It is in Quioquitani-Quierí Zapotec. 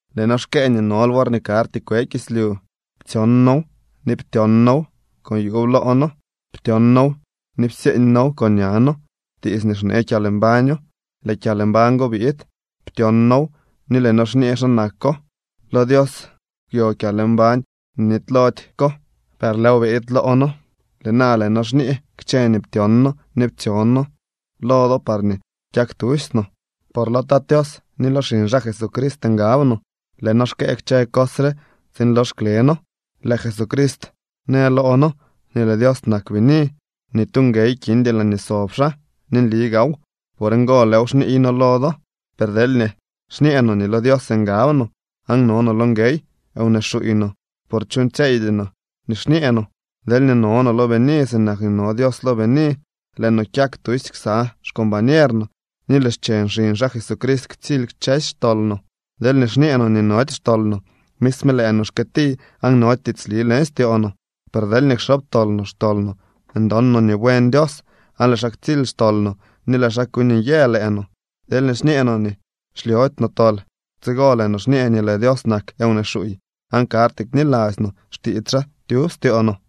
Lëë noo xkëë nii nol worñee karty kwe kislyu. Ptsyon noow ni ptyon noow con yuub loo noo. Ptyon noow ni psyeeñ noow con ña noo. Tiits nii xnee kyalmbaño. Lëë kyalmbañ go biid. Ptyon noow ni lëë noo xñee xa nako. Lo Dios kwyo kyalmbañ nii nitylody ko, per lëëw biid loo noo. Lëë na lëë noo xñee kchë nii ptyon noo ni ptsyon noo lo do parñee kyak tusy no, por lo Tat Tios ni lo xiñ xaa Jesucrist ngab no. Lëë noo xkëë kchë cos re tsiin lox kle noo. Lëë Jesucrist në loo noo nii lëë Dios nak bini. Ni tu nguey kindy laañee sob xaa, ni nli gaaw. Por ngo lëëw xniiy noo lo do. Per deelñee xñee no nii lo Dios ngab no, aan no no lo nguey, wnee xuuy no, por chuuñtsyeeydy no nii xñee no. Deelñee no no lo bini sinak nii no Dios lo bini, lëë no kyak tusy ksa xcombañer no ni lëë xcheñ xiñ xaa Jesucrist ktsily kchësy xtol no. Deelñee xñee no nii nody xtol no, misme lëë no xkyëti, aan nody tiitsli leñ styoo no. Per deelñee kxobtol no xtol no, ndon no nii buen Dios, aan lëë xaa ktsily xtol no ni lëë xaa kuuñ nyë lëë no. Deelñee xñee no nii xlyody no tol, tsigo lëë no xñee nii lëë Dios nak wnee xuuy, aan karty kniladzy no xtiits xaa tyub styoo no.